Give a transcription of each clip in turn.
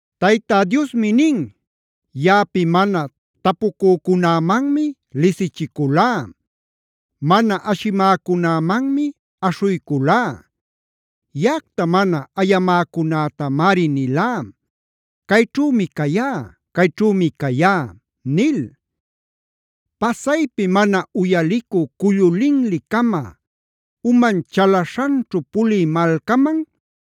Tayta Diosmi nin: “Yaꞌapi mana tapucücunämanmi lisichiculá. Mana ashimäcunämanmi aśhuyculá.a Yaꞌacta mana ayacamäcunätamari nilá: ‘Cayćhümi cayá; cayćhümi cayá’ nil. Pasaypi mana uyalicü cullu linli-cama, uman chalaśhanćhu pulï malcaman,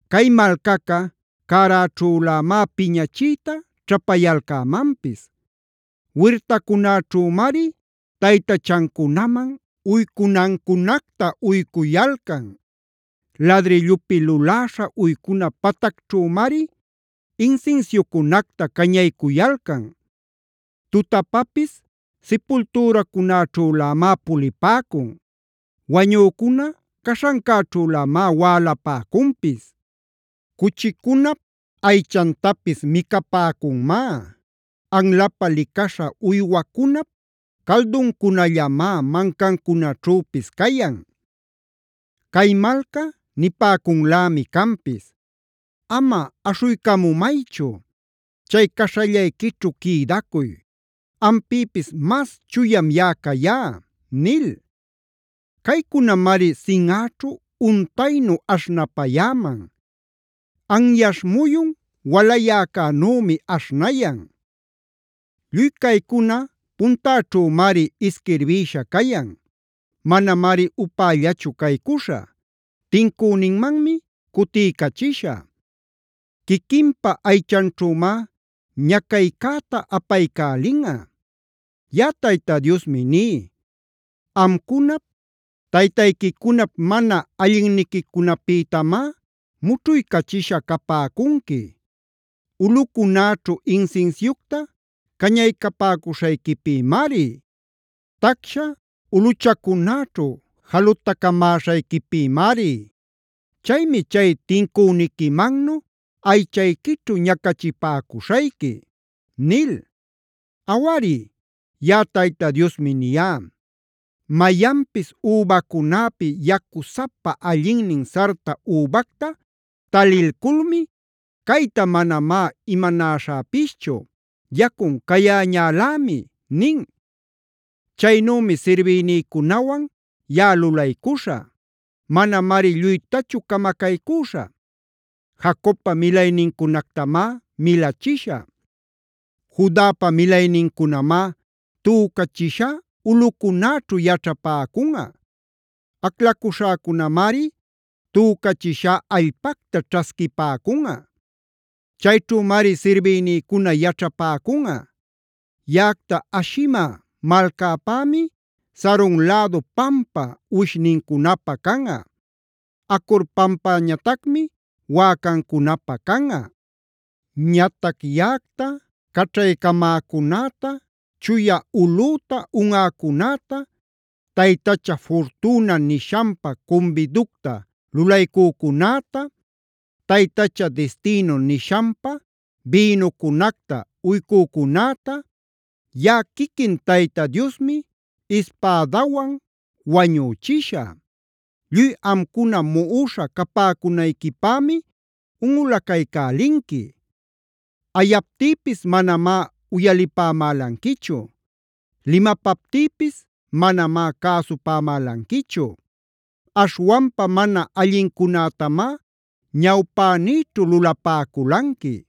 Cay malcaca cäräćhülämá piñachiyta ćhapayalcämanpis; wirtacunäćhümari taytachancunaman uycunancunacta uycuyalcan; ladrillupi luläśha uycuna patacćhümari, insinsiucunacta cañaycuyalcan. Tutapapis sipultüracunäćhülämá pulipäcun; wañücuna caśhancäćhülämá wälapäcunpis. Cuchicunap aychantapis micapäcunmá;c anlapä licaśha uywacunap calduncunallamá mancancunaćhüpis cayan. Cay malca nipäcunlämi canpis: ‘Ama aśhuycamumaychu; chay caśhallayquićhu quïdacuy. Ampïpis mas chuyam yaꞌa cayá’ nil. Caycunamari sinꞌäćhu untaynu aśhnapayäman; anyaśh muyun walayäcänümi aśhnayan. “Lluy caycuna puntäćhümari isquirbïsha cayan. Manamari upällachu caycuśhä. Tincüninmanmi cutiycachishä; quiquinpa aychanćhümá ñacaycäta apaycälinꞌa. Yaꞌa Tayta Diosmi ní: ‘Amcunap, taytayquicunap mana allinniquicunapïtamá mućhuycachisha capäcunqui, ulꞌucunäćhu insinsiucta cañapäcuśhayquipïmari, tacsha ulꞌuchacunäćhu jalutacamäśhayquipïmari. Chaymi chay tincüniquimannu aychayquićhu ñacachipäcuśhayqui’ nil. “Awari, yaꞌaTayta Diosmi niyá: ‘Mayanpis übacunäpi yacusapa allinnin sarta übacta talilculmi: “Cayta manamá imanaśhäpischu; yacun cayäñälämi” nin. Chaynümi sirbïnïcunawan yaꞌa lulaycuśhä. Manamari lluytachu camacaycüśhä. Jacobpa milaynincunactamá milachishä; Judapa milaynincunamá tücachishá ulꞌücunäćhu yaćhapäcunꞌa. Aclacuśhäcunämari tücachishá allpacta ćhasquipäcunꞌa; chayćhümari sirbïnïcuna yaćhapäcunꞌa. Yaꞌacta ashimä malcäpämi, Saron lädu pampa uwishnincunapä canꞌa; Acord pampäñatacmi wäcancunapä canꞌa. “ ‘Ñatac yaꞌacta caćhaycamäcunäta, chuya ulꞌüta unꞌacunäta, taytacha Fortuna nishanpä cumbiducta lulaycücunäta, taytacha Destino nishanpä bïnucunacta uycücunäta, yaꞌa quiquin Tayta Diosmi ispädawan wañüchishä. Lluy amcuna muꞌuśha capäcunayquipämi unꞌulaycälinqui. Ayaptïpis manamá uyalipämälanquichu. Limapaptïpis manamá cäsupämälanquichu. Aśhwanpa mana allincunätamá ñawpänïćhu lulapäculanqui;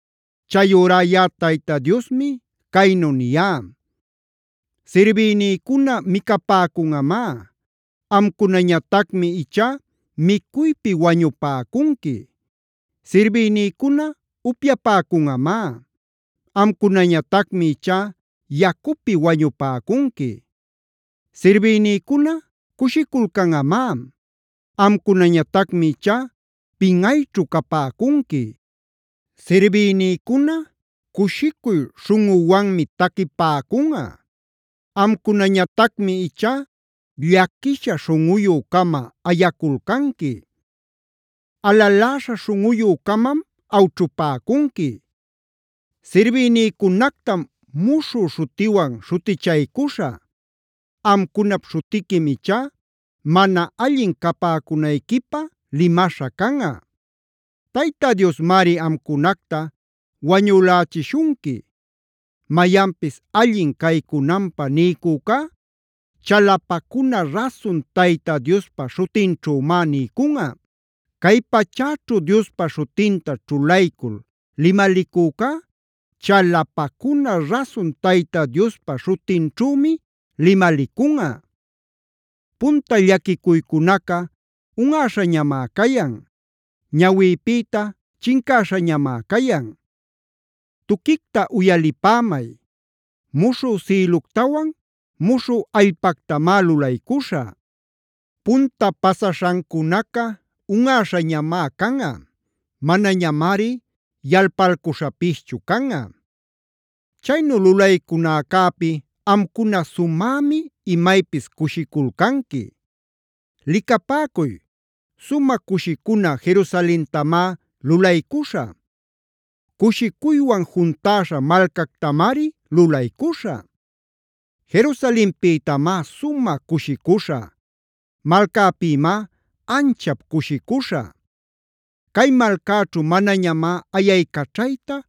“Chayurá yaꞌa Tayta Diosmicaynu niyá: ‘Sirbïnïcuna micapäcunꞌamá; amcunañatacmi ichá micuypi wañupäcunqui. Sirbïnïcuna upyapäcunꞌamá; amcunañatacmi ichá yacupi wañupäcunqui. Sirbïnïcuna cushiculcanꞌamá; amcunañatacmi ichá pinꞌayćhu capäcunqui. Sirbïnïcuna cushicuy śhunꞌuwanmi taquipäcunꞌa; amcunañatacmi ichá llaquisha śhunꞌuyü-cama ayaculcanqui; alaläśha śhunꞌuyü-camam awćhupäcunqui. Sirbïnïcunactam muśhü śhutiwan śhutichaycuśhä; amcunap śhutiquim ichá mana allin capäcunayquipä limaśha canꞌa; Tayta Diosmari amcunacta wañülächishunqui. Mayanpis allin caycunanpä niycücá chalapacuna rasun Tayta Diospa śhutinćhümá niycunꞌa. Cay pachäćhu Diospa śhutinta ćhulaycul limalicücá chalapacuna rasun Tayta Diospa śhutinćhümi limalicunꞌa. Punta llaquicuycunaca unꞌaśhañamá cayan; ñawïpïta chincäśhañamá cayan. “ ‘Tuquicta uyalipämay. Muśhü sïluctawan muśhü allpactamá lulaycuśhä.f Punta pasaśhancunaca unꞌäśhañamá canꞌa; manañamari yalpalcuśhapischu canꞌa. Chaynu lulaycunäcäpi amcuna sumämi imaypis cushiculcanqui. Licapäcuy, sumä cushicuna Jerusalentamá lulaycuśhä; cushicuywan juntäśha malcactamari lulaycuśhä. Jerusalenpïtamá sumä cushicuśhä; malcäpïmá anchap cushicuśhä. Cay malcäćhu manañamá ayaycaćhayta,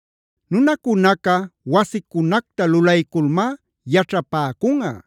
Nunacunaca wasicunacta lulayculmá yaćhapäcunꞌa.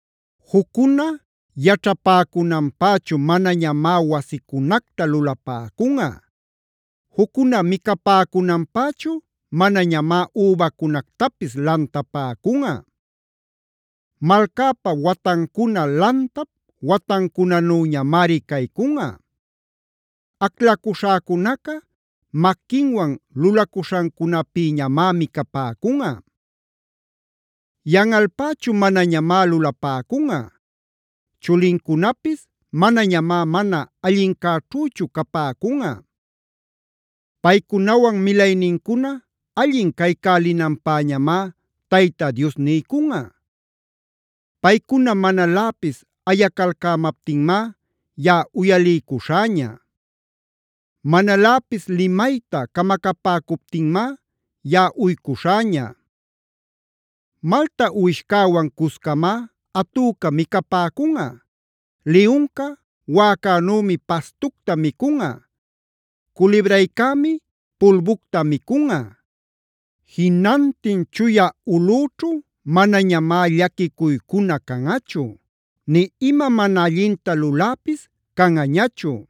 Juccuna yaćhapäcunanpächu manañamá wasicunacta lulapäcunꞌa; juccuna micapäcunanpächu manañamá übacunactapis lantapäcunꞌa. Malcäpa watancuna lantap watancunanüñamari caycunꞌa. Aclacuśhäcunaca maquinwan lulacuśhancunapïñamá micapäcunꞌa. Yanꞌalpächu manañamá lulapäcunꞌa; chulincunapis manañamá mana allincäćhüchu capäcunꞌa. Paycunawan milaynincuna allin caycälinanpäñamá Tayta Dios niycunꞌa. Paycuna manaläpis ayacalcämaptinmá yaꞌa uyaliycuśhäña. Manaläpis limayta camacapäcuptinmá yaꞌa uycuśhäña. Malta uwishcäwan cuscamá atüca micapäcunꞌa. Liyunca wäcanümi pastucta micunꞌa. Culibraycämi pulbucta micunꞌa.i Jinantin chuya ulꞌüćhu manañamá llaquicuycuna canꞌachu, nï ima mana allinta luläpis canꞌañachu.